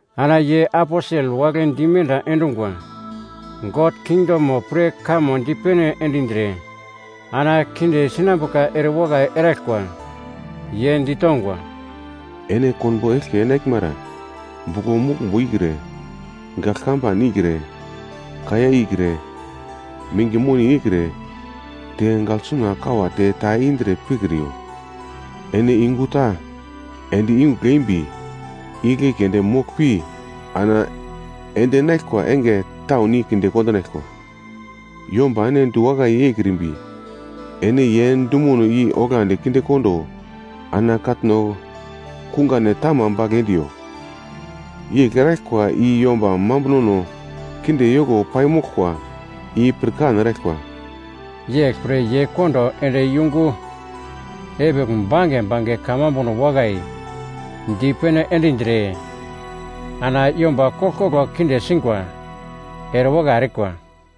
Ana ye aposel wagle dimenda endungwa, God kingdom pre kamo dipene endindre ana kinde sinambuka erewakai eraglkwa. Ye ditongwa, “Ene konbo eglke enaglmara buglo muglmbo ikre, gagl kamban ikre, kaiya ikre, minge moni ikre, te gaglsuna kawate ta indre pikriyo. Ene yungu ta ende yungugl eimbi, igle keunde moglpi ana ende enaglkwa enge taun i kondinaglkwa. Yomba ene diwakai yeikrimbi, ene ye dumono i oglandi kinde kondo ana katno kungane tama bagl endiyo. Yegl eraglkwa i yomba mambunono kinde yoko paimoglkwa i pirkan eraglkwa.” Yeglpre ye kondo ende yungu epigl bange bange kamambuno wakai dipene endindre ana yomba koglkoglo kinde singwa erewakai erikwa.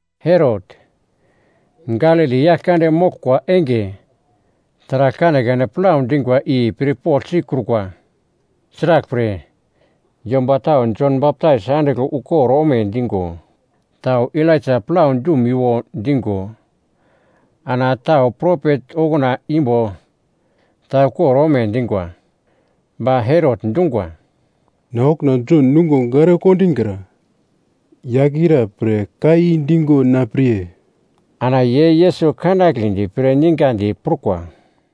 Herot, Galili yaglkande moglkwa enge taragl kanekane plau dingwa i pirpogl sikrukwa. Sraglpre, yomba tau Jon Baptais andigl ukor ome digo, tau Elaija plau dumiwo digo, ana tau propet okuna imbo ta ukor ome dingwa. Ba Herot dungwa, “Na okuna Jon nungo gare kondingra. Yagl ira pre ka i digo na pirye?” Ana ye Yesus kanagledi pre ningadi prukwa.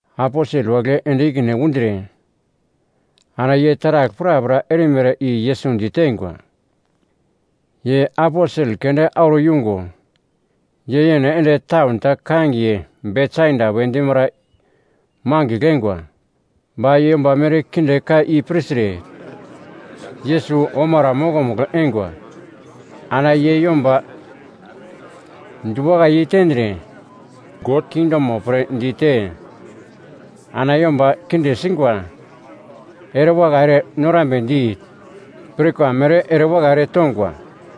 Aposel wagle ende ikine undre ana ye taragl prapra erimere i Yesus diteingwa. Ye aposel keunde auro yungo, ye yene ende taun ta kangiye Betsaida we dimara mangigl eingwa. Ba yomba merkinde ka i pirtre, Yesus omara mokomugl eingwa. Ana ye yomba diwakai yei tendre, God kingdomo pre dite ana yomba kinde singwa erewakai ere norambedi pirkwa mere erewakai eretongwa.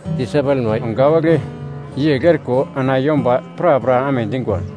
Disaipelma wagle yegl eriko ana yomba prapra amedingwa.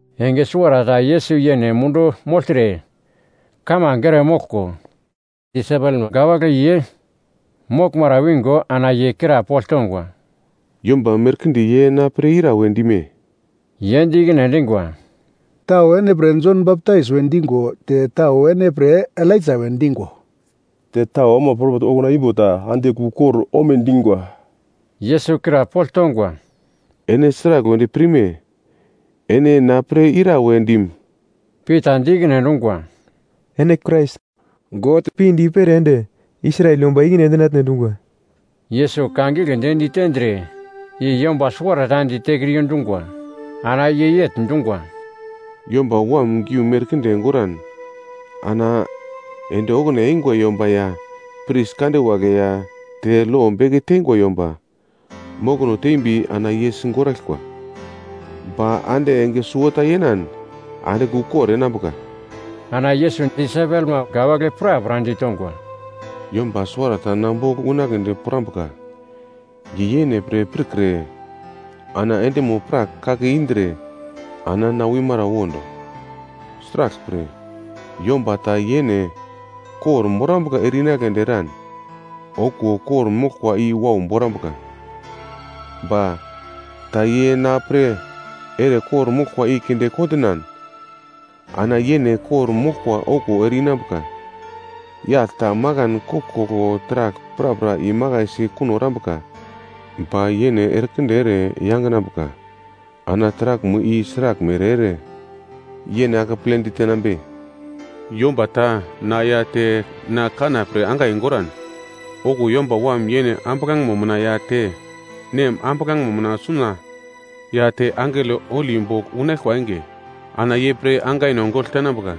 Enge suwarata Yesus yene mundu mogltre kamange ere moglko, disaipelma wagle ye moglmara wingo ana ye krapogl tongwa, “Yomba merkinde ye na pre ira we dime?” Ye di ikine endingwa, “Tau ene pre Jon Baptais we digo te tau ene pre, Elaija we digo, te tau ama propet okuna imbo ta andigl ukor omedingwa.” Yesus krapogl tongwa, “Ene sragl wedi pirme? Ene na pre ira we dim?” Pita di ikine endungwa, “Ene Krais God pinde i-pere ende Israel yomba i-ikine endinatne dungwa.” Yesus ka giglendi ditendre, i yomba suwarata ditekriyo dungwa. Ana ye yegl dungwa, “Yomba Wam giu merkinde goran ana ende okuna eingwa yomba ya pris kande wagle ya te lo beke teingwa yomba mokono tembi ana ye sigoraglkwa. Ba ande enge suwota yenan andigl ukor enambuka.” Ana Yesus disaipelma wagle prapra ditongwa, “Yomba suwarata na bogl unagledi pirambuka, ye yene pre pirkre ana endimo-prak kake indre, ana na wimara wondo. Sraglpre yomba ta yene kor-morambuka ere-inagledi eran, okuwo kor-moglkwa i wau borambuka. Ba, ta ye na pre ere kor-moglkwa i kinde kondinan ana yene kor-moglkwa okuwo ere-inambuka. Yagl ta makan koglkoglo taragl prapra imakaisi kuno erambuka, ba yene erekinde ere yanginambuka ana taraglmo i sraglmere ere yene akeple ditenambe? Yomba ta na ya te na kanna pre angai goran, okuwo Yomba Wam yene ambuglangemo mina ya te, Nem ambuglangemo mina suna ya te angelo holi bogl unaglkwa enge ana ye pre angaino gogl tenambuka.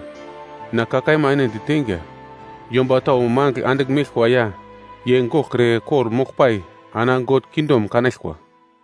Na ka kaima ene diteinga, yomba tau mangigl andigl meglkwa ya, ye goglkre kor-moglpai ana God kingdom kanaglkwa.”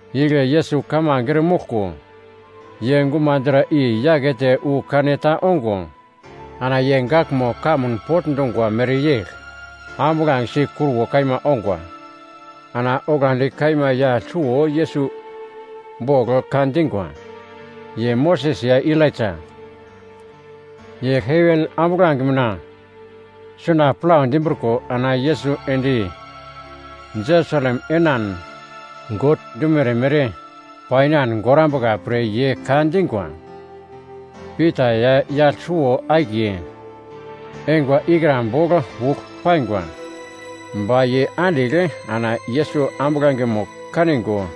Igle Yesus kamange eremoglko, ye gumadra i-yakete wu kaneta ongo, ana ye gaglmo kamun pogl dungwa mereyegl ambuglangesi kruwo kaima ongwa. Ana oglandi kaima yagl suwo Yesus bogl ka dingwa, ye Moses ya Elaija. Ye heven ambuglange mina suna plau dimbriko ana Yesus ende Jerusalem enan God dumere mere pai inan gorambuka pre ye ka dingwa. Pita ya yagl suwo-akiye eingwa ikra bogl ugl paingwa, ba ye andigl ana Yesus ambuglangemo kanigo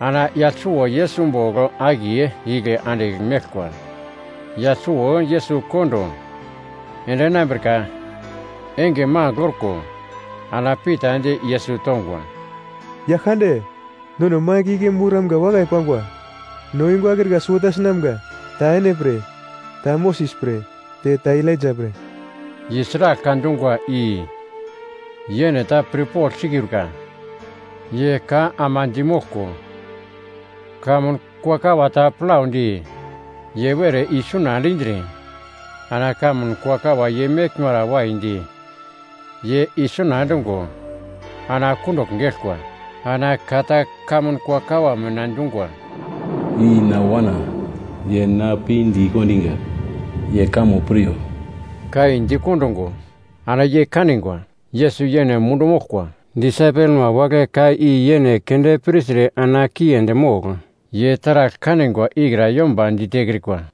ana yagl suwo Yesus bogl akiye igle andigl meglkwa. Yagl suwo Yesus kondo ende enambrika enge magl orko, ana Pita di Yesus tongwa, “Yaglkande, nono mangigl igle moramga wakai pangwa. No yungu akrika suwota sinamga, ta ene pre, ta Moses pre, te ta Elaija pre.” (Ye sragl ka dungwa i yene ta pirpogl sikrukwa.) Ye ka ama dimoglko, kamun kuakawa ta plaudi, ye were isuna endindre, ana kamun kuakawa ye meglmara waidi ye isuna endungo, ana kundugl geglkwa. Ana ka ta kamun kuakawa mina dungwa, “I na Wana, ye na pinde i kondiga, ye kamo piryo.” Ka i di kondungo, ana ye kanigwa Yesus yene mundu moglkwa. Disaipelma wagle ka i yene keunde pirtre ana kiendi mogl, ye taragl kanigwa ikra yomba ditekrikwa.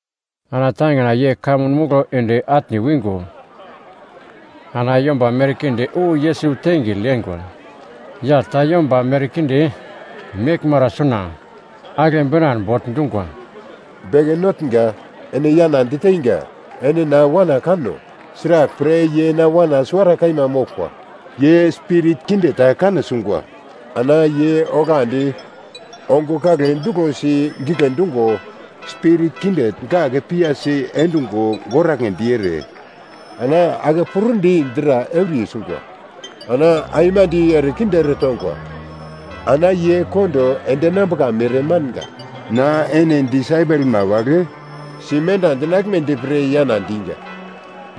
Ana tangina ye kamun muglo ende atne wingo, ana yomba merkinde wu Yesus tengigl yeingwa. Yagl ta yomba merkinde meglmara suna, agle binan bogl dungwa, “Beke Notnga! Ene yana diteinga, ene na wana kano; sraglpre ye na wana suwara kaima moglkwa! Ye spirit kinde ta kane sungwa, ana ye oglandi ongo kagle duglosi gigle dungo, spirit kinde gak piyasi endungo goragledi ere, ana ake pur-di dra euriye sungwa. Ana aimande erekinde eretongwa ana ye kondo ende enambuka mere manga. Na ene disaipelma wagle simenda endinaglmedi pre yana diga,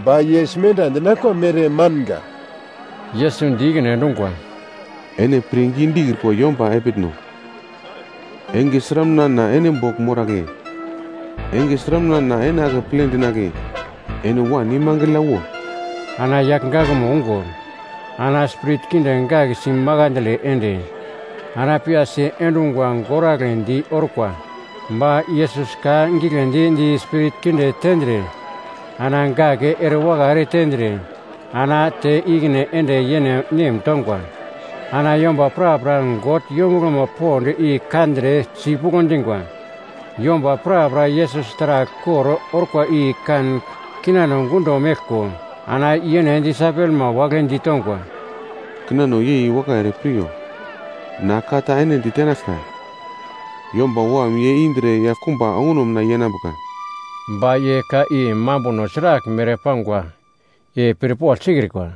ba ye simenda endinaglkwa mere manga.” Yesus di ikine endungwa, “Ene pirngi dikrikwa yomba epitno. Enge sramuna na ene bogl moragle? Enge sramuna na ene akeple dinagle? Ene wan imangigl yawo.” Ana yagl gakmo ungo, ana spirit kinde gak si makandle ende, ana piyasi endungwa goragledi orkwa. Ba Yesus ka giglendi di spirit kinde tendre, ana gak erewakai ere tendre, ana te ikine ende yene nem tongwa. Ana yomba prapra God yombuglomo pond i kandre, sipuglo dingwa. Yomba prapra Yesus taragl kor orkwa i kan kinano gundo meglko, ana yene disaipelma wagle ditongwa, “Kinano yei wakai ere piryo, na ka ta ene ditenaglka. Yomba Wam ye indre yaglkumba onguno mina yenambuka.” Ba ye ka i mambuno sraglmere pangwa i pirpogl sikrikwa.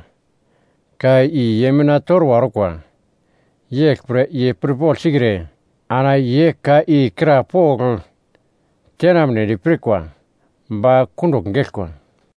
Ka i ye mina torwa orkwa, yeglpre ye pirpogl sikre, ana ye ka i krapogl tenamnedi pirkwa ba kundugl geglkwa.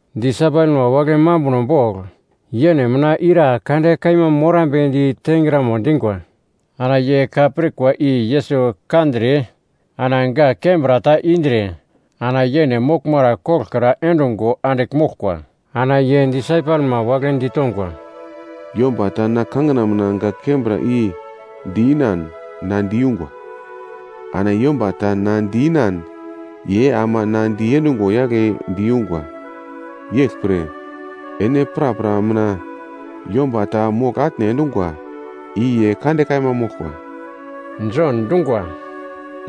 Disaipelma wagle mambuno bogl yene mina ira kande kaima morambedi tengramo dingwa. Ana ye ka pirkwa i Yesus kandre ana gak kembra ta indre ana yene moglmara koglokra endungo andigl moglkwa. Ana ye disaipelma wagle ditongwa, “Yomba ta na kangina mina gak kembra i di-inan na diyungwa, ana yomba ta na di-inan ye ama na diendungwa yagle diyungwa. Yeglpre ene prapra mina yomba ta mogl-atne endungwa i ye kande kaima moglkwa.” Jon dungwa,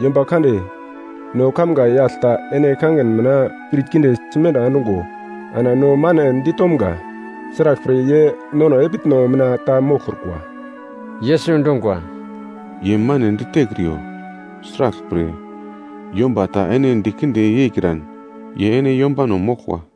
“Yomba kande, no kamga yagl ta ene kangin mina spirit kinde simenda endungo, ana no mane ditomga. Sraglpre ye nono epitno mina ta moglkrukwa.” Yesus dungwa, “Ye mane ditekriyo, sraglpre yomba ta ene dikinde yeikran, ye ene yombano moglkwa.”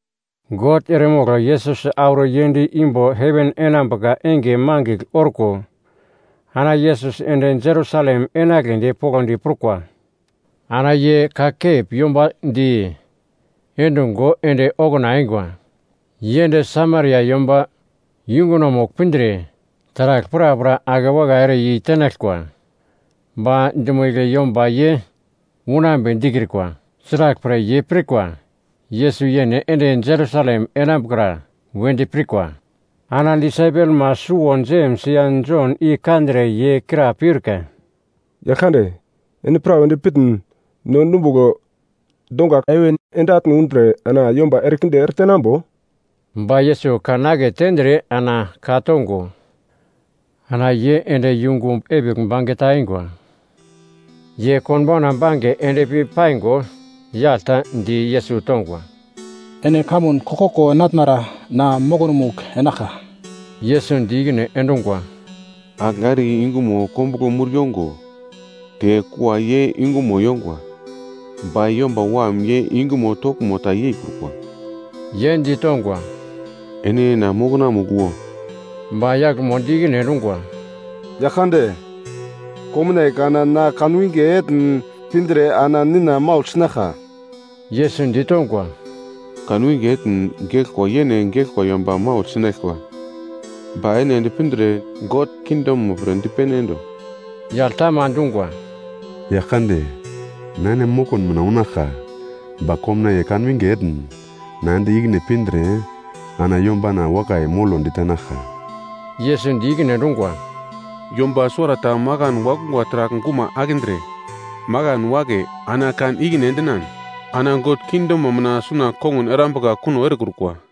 God eremogl Yesus auro yend imbo heven enambuka enge mangigl orko, ana Yesus ende Jerusalem enagledi poglodi prukwa. Ana ye kakep yomba di endungo ende okuna eingwa. Ye ende Samaria yomba yungunomugl pindre, taragl prapra ake wakai ere yeitenaglkwa. Ba dumo igle yomba ye unambe dikrikwa. Sraglpre ye pirkwa Yesus yene ende Jerusalem enambukra wedi pirkwa. Ana disaipelma suwo Jems ya Jon i kandre, ye kra peurka, “Yaglkande, ene pra wedi pitn, no dumbugl donga heven ende atne undre ana yomba erekinde ere tenambo?” Ba Yesus kan aketendre ana ka-tongo, ana ye ende yungu epigl bange ta eingwa. Ye konbauna bange endpi paingo, yagl ta di Yesus tongwa, “Ene kamun koglkoglo enatnara na mokonomugl enaglka.” Yesus di ikine endungwa, “Agl are yungumo kombuglo mur yongo, te kua ye yungumo yongwa, ba Yomba Wam ye yungumo toglmo ta yeikrukwa.” Ye di tongwa, “Ene na mokonamugl wo!” Ba yaglmo di ikine endungwa, “Yaglkande, komnaiye kana na kanwinge etn pindre ana nina maugl sinaglka.” Yesus ditongwa, “Kanwinge etn geglkwa yene geglkwa yomba maugl sinaglkwa, ba ene ende pindre God kingdom pre dipene endo.” Yagl ta ama dungwa, “Yaglkande, na ene mokon mina unaglka, ba komnaiye kanwinge etn na ende ikine pindre, ana yombana wakai molo ditenaglka.” Yesus di ikine endungwa, “Yomba suwarata makan wakungwa taragl guma akindre, makan wake, ana kan ikine endinan, ana God kingdomo mina suna kongun erambuka kuno erekrukwa.”